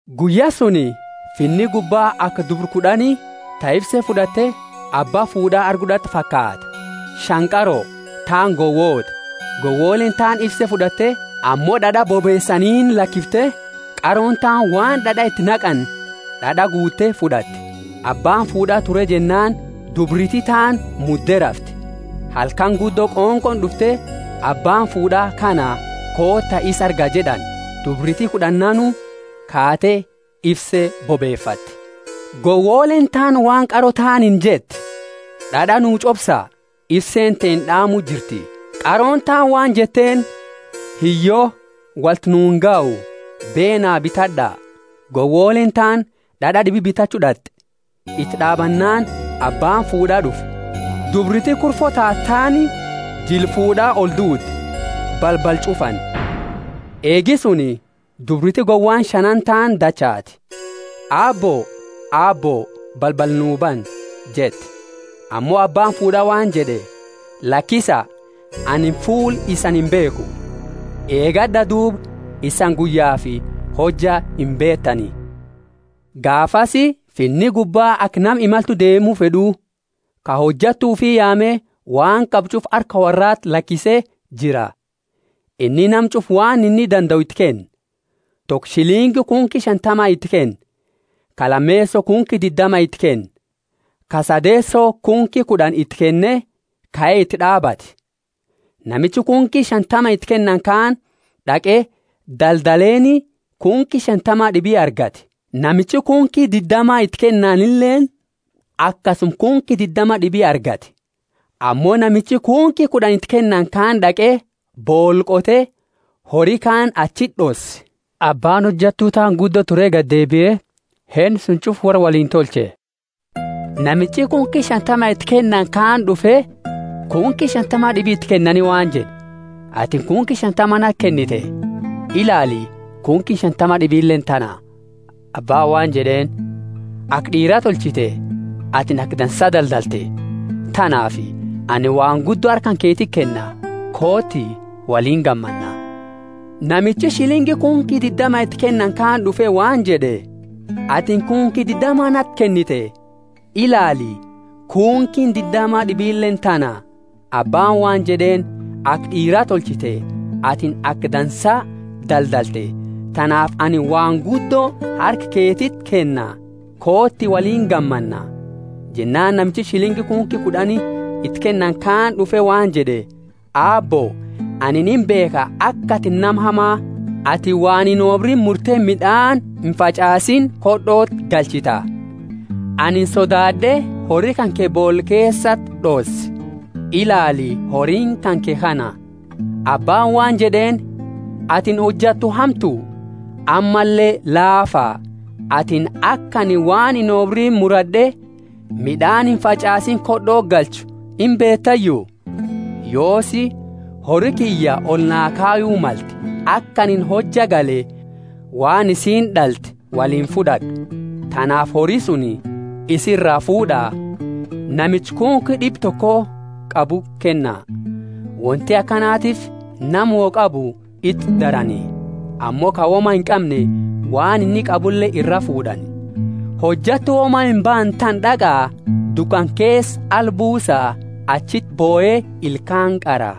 Guyya suni Finni gubba aka dubra kud'ani, ta ifse fud'atte, abba fuud'a argu d'at'e fakaata. Shani qaro, taani gowoota. Gowoleeni taani ifse fud'atte, ammo d'ad'a bobeesaniini lakifte; qarooni taani waan d'ad'a iti naqani d'ad'a guute fud'atte. Abbaani fuud'aa ture jennaani dubriti taani mudde rafte. Halkani guddo qonqooni d'ufte, Abbaani fuud'a kana, koota isa arga jed'ani. Dubriti kud'annaanu kaate ifse bobefatte. Gowoleeni taani waan qaro taaniini jette, D'ad'a nu ch'obsa; ifseeni teenna d'aamu jirti. Qarooni taani waan jetteeni, Hiyyo, wolti nu ingahu, beena bitad'a. Gowoleeni taani d'ad'a d'ibi bitachu d'at'i, iti d'aabannaani, abbaani fuud'aa d'ufe. Dubriti kurfo taate taani jila fuud'a olduude, balbala ch'ufani. Eegi suni dubriti gowaani shanaani taani dachaate, Aabbo, Aabbo, balbala nu bani jette. Ammo abbaani fuud'a waan jed'e, Lakisa, anini fuula isani imbeekhu. Eegad'a duuba, isani guyyafi hojja imbeetani. Gaafasi finna gubbaa aka nama imaltu deemu fed'u, ka hojattu ufi yaame, waan qabu ch'ufa harka worraati lakise jira. Inni nama ch'ufa waan inni dandau iti kenne. Toko shilingi kunki shantama iti kenne, ka lameeso kunki diddama iti kenne, ka sadeeso kunki kud'ani iti kenne, kae iti d'aabate. Namichi kunki shantama iti kennani kaani d'aqe daldaleeni, kunki shantama d'ibi argate. Namichi kunki diddama iti kennanileeni akasuma kunki diddama d'ibi argate. Ammo namichi kunki kud'ani iti kennani kaani d'aqe, boola qote, hori kaani achiti d'osse. Abbaani hojattu taani guddo ture gadi deebie, henna suni ch'ufa worra woliini tolche. Namichi kunki shantama iti kennani kaani d'ufe, kunki shantama d'ibi iti kenne waan jed'e, Atini kunki shantama nati kennite, ilaali, kunkiini shantama d'ibileeni tana. Abbaani waan jed'eeni, Aka d'iiraa tolchite, atini aka dansaa daldalte, tanaafi anini waan guddo harka keetiti kenna. Kooti, woliini gammanna. Namichi shilingi kunki diddama iti kennani kaani d'ufe waan jed'e, Atini kunki diddama nati kennite, ilaali, kunkiini diddama d'ibileeni tana. Abbaani waan jed'eeni, Aka d'iiraa tolchite, atini aka dansaa daldalte, tanaafi anini waan guddo harka keetiti kenna. Kooti, woliini gammanna. Jennaani namichi shilingi kunki kud'ani iti kennani kaani d'ufe waan jed'e, Aabbo, anini imbeekha aka atini nama hama, atini waan inobriini murte mid'aani imfach'aasiini khod'oti galchita. Anini sodaad'e hori kanke boola keesati d'osse; ilaali, horiini kanke kana. Abbaani waan jed'eeni, Atini hojattu hamtu, ammalle laafa; atini aka anini waan inobriini murad'e mid'aani imfach'aasiini khod'oti galchu imbeetayu? Yoosi, hori kiyya oli naa kayu malte, aka anini hojja gale waan isiini d'alte woliini fud'ad'u. Tanaafi hori suni isa iraa fuud'a, namicha kunki d'ibba toko qabuti kenna. Wonti akanatiifi nama woi qabu iti darani, ammo ka woma inqamne waan inni qabule iraa fuud'ani. Hojattu woma imbaane tana d'aqa, dukana keesa ala buusa; achiti bohe ilkaani qara.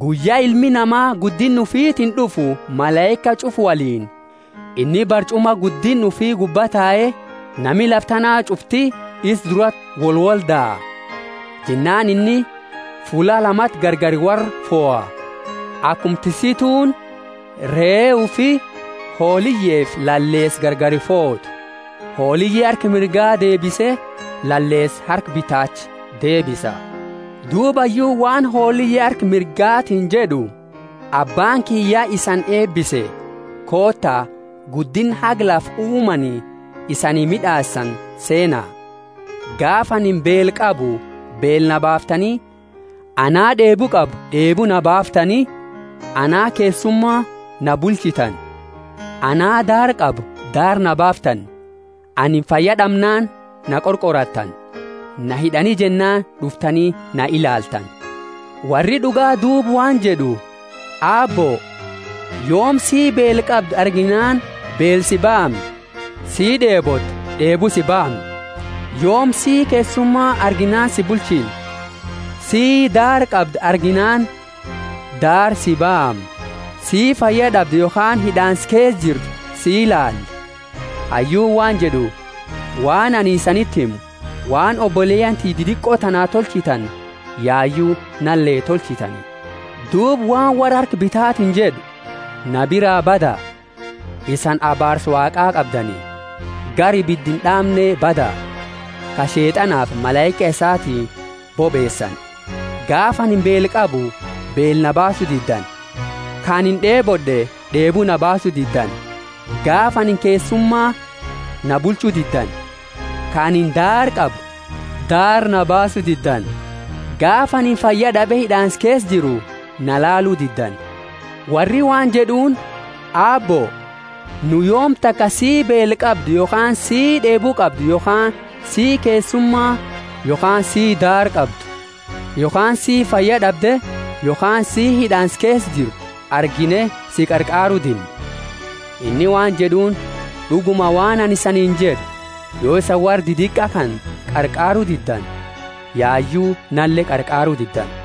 Guyya Ilmi Nama guddinna ufitiini d'ufu malaika ch'ufa woliini, inni barch'uma guddinna ufi gubba tae, nami lafa tana ch'ufti isa durati wolwoldaa. Jennaani inni fulla lamati gargari worra foha, akuma tissituuni ree ufi, hooliyefi laleesa gargari footu: hooliye harka mirga deebise, laleesa harka bitaacha deebisa. Duuba Hayyuuni waan hooliye harka mirgatiini jed'u, Abbaani kiyya ya isani eebise, koota, guddinna haga lafa uumani isani mid'aasani seena. Gaafa anini beela qabu beela naa baaftani, ana d'eebu qabu, d'eebu naa baaftani, ana keessuma na bulchitani, ana daara qabu daara na baaftani, anini fayya d'amnaani na qorqorattani, na hid'ani jennaani d'uftani na ilaaltani. Worri d'uga duuba waan jed'u, Aabbo, yoomi sii beela qabdu arginaani beela si baamne, sii d'eebote d'eebu si baamne? Yoomi sii keessuma arginaani si bulchine, sii daara qabdu arginaani daara si baamne, sii fayya d'abde yokhaani hid'aansa keesa jirtu si ilaale? Hayyuuni waan jed'u, Waan anini isaniti himu, waan oboleyaani tiyya didiqo tanaa tolchitani yayu nale tolchitani. Duuba waan worra harka bitatiini jed'u, Na biraa bada, isani abaarsa Waaqa qabdani; gara ibida ind'aamne bada, ka Sheet'anafi malaika isaati bobeesani! Gaafa anini beela qabu beela na baasu diddani, ka anini d'eebod'e d'eebu na baasu diddani; gaafa anini keessuma na bulchu diddani, ka anini daara qabu daara na baasu diddani; gaafa anini fayyad'abe hid'aansa keesa jiru na ilaalu diddani. Worri waan jed'uuni, Aabbo, nu yoomi taka sii beela qabdu yokhaani sii d'eebu qabdu yokhaani sii keessuma yokhaani sii daara qabdu yokhaani sii fayyad'abde yokhaani sii hid'aansa keesa jirtu argine si qarqaaru dinne? Inni waan jed'uuni, D'uguma, waan anini isaniini jed'u, yo isani worra didiqa kana qarqaaru diddani, yayu nale qarqaaru diddani.